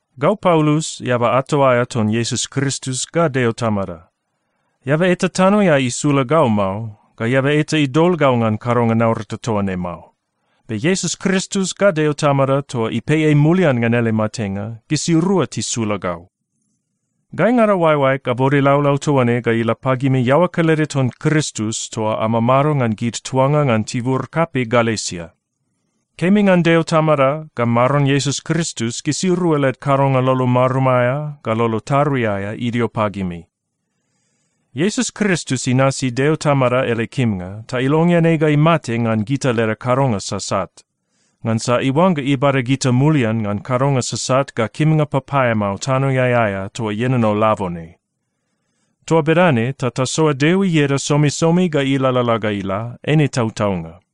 Gau Paulus, eaba ato aea ton Iesus Kristus ga Deo Tamada. Eaba eta tanoeai isula gau mao, ga eaba eta idol gau ngan kadonga naurata toa ne mao. Be Iesus Kristus ga Deo Tamada toa ipei ei mulian ngan ele matenga, gisirua tisula gau. Gaingada oaeoaeg abode laulau toa ne ga ila pagimi iaoa kelede ton Kristus toa amamado ngan gid tuanga ngan tibur kapei Galesia. Kemi ngan Deo Tamada ga Maron Iesus Kristus, gisirua led kadonga lolo marum aea ga lolo tarui aea idio pagimi. Iesus Kristus inasi Deo Tamada ele kimnga ta ilongean ei ga imate ngan gita leda kadonga sasat, ngansa iuangga ibada gita mulian ngan kadonga sasat ga kimnga papaeamao tanoeai aea toa ienono labone. Toa bedane ta tasoa Deo ieda somisomi ga ilalala ga ila. Eine tautaunga.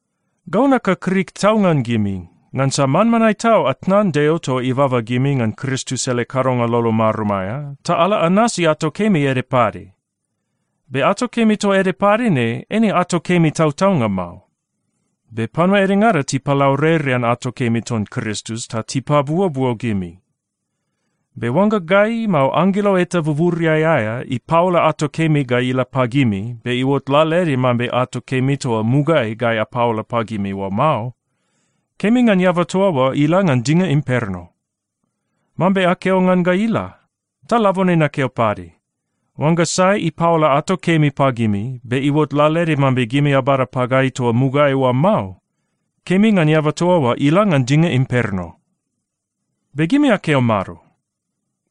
Gau nakakrik tau ngan gimi, ngansa manmanae tau atnan Deo toa ibaba gimi ngan Kristus ele kadonga lolo marum aea, ta ala anasi ato kemi ede pade. Be ato kemi toa ede pade ne, eine ato kemi tautaunga mao. Be panua edengada tipalaurerean ato kemi ton Kristus ta tipabuobuo gimi. Be oangga gai, mao anggelo eta buburiai aea ipaola ato kemi ga ila pagimi, be iuot lalaede mambe ato kemi toa mugaeai gai apaola pagimi oa mao, kemi ngan eaba toa oa ila ngan dinga imperno. Mambe akeo ngan ga ila, ta labone nakeo pade, oangga sai ipaola ato kemi pagimi, be iuot lalaede mambe gimi abada pagai toa mugaeai oa mao, kemi ngan eaba toa oa ila ngan dinga imperno! Be gimi akeo mado?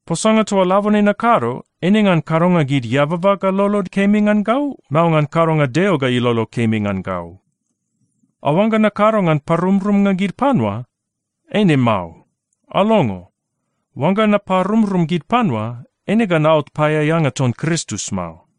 Posanga toa labone nakado, eine ngan kadonga gid eababa ga lolod kemi ngan gau, mao ngan kadonga Deo ga ilolo kemi ngan gau? Aoangga nakado ngan parumrumnga gid panua? Eine mao. Alongo. Oangga naparumrum gid panua, eine ga naot paeaeanga ton Kristus mao.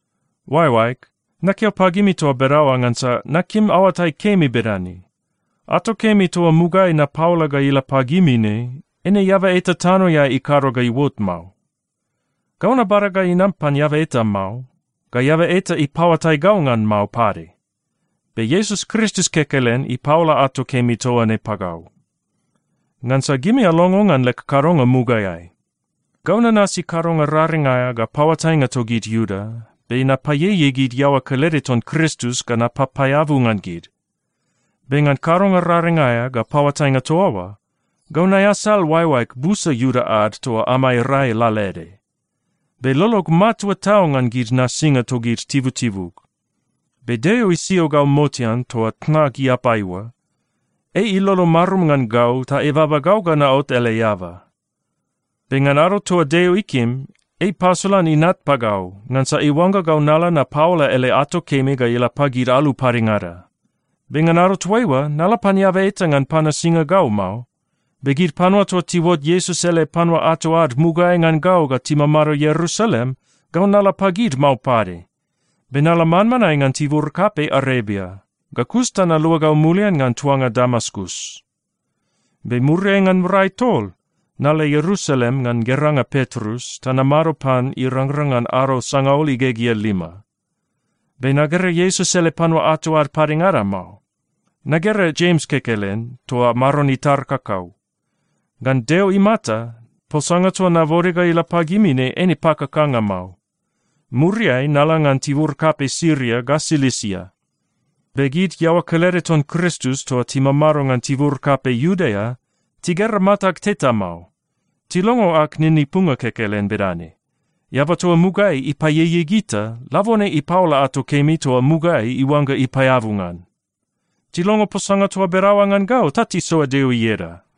Oaeoaeg, nakeo pagimi toa bedaoa ngansa nakim aoatai kemi bedane: Ato kemi toa mugaeai napaola ga ila pagimi ne, eine eaba eta tanoeai ikado ga iuot mao. Gau nabada ga inam pan eaba eta mao, ga eaba eta ipaoatai gau ngan mao pade. Be Iesus Kristus kekelen ipaola ato kemi toa ne pagau. Ngansa gimi alongo ngan leg kadonga mugaeai. Gau nanasi kadonga raring aea ga paoatainga togid Iuda. Be napaieiei gid iaoa kelede ton Kristus ga napapaeabu ngan gid. Be ngan kadonga raring aea ga paoatainga toa oa, gau naeasal oaeoaeg busa Iuda ad toa amai rai lalaede. Be lolog matua tau ngan gid nasinga togid tibutibug. Be Deo isio gau motean toa tnag iapai oa. Ei ilolo marum ngan gau ta ibaba gau ga naot ele eaba. Be ngan ado toa Deo ikim, ei ipasolan Inat pagau, ngansa iuangga gau nala napaola ele ato kemi ga ila pagid alu padengada. Be ngan ado toaiua, nala pan eaba eta ngan panasinga gau mao. Be gid panua toa tiuot Iesus ele panua ato ad mugaeai ngan gau ga timamado Ierusalem, gau nala pagid mao pade. Be nala manmanae ngan tibur kapei Arebia, ga kus ta naluagau mulian ngan tuanga Damaskus. Be muriai ngan rai tol, nala Ierusalem ngan geranga Petrus ta namado pan irangrang ngan ado sangaul igegea lima. Be nagera Iesus ele panua ato ad padengada mao. Nagera Jems kekelen, toa Maron itar kakau. Ngan Deo imata, posanga toa nabode ga ila pagimi ne, eine pakakanga mao. Muriai nala ngan tibur kapei Siria ga Silisia. Be gid iaoa kelede ton Kristus toa timamado ngan tibur kapei Iudea, tigera matag teta mao. Tilongo ag ninipunga kekelen bedane, “Eaba toa mugaeai ipaieiei gita, labone ipaola ato kemi toa mugaeai iuangga ipaeabu ngan.” Tilongo posanga toa bedaoa ngan gau ta tisoa Deo ieda.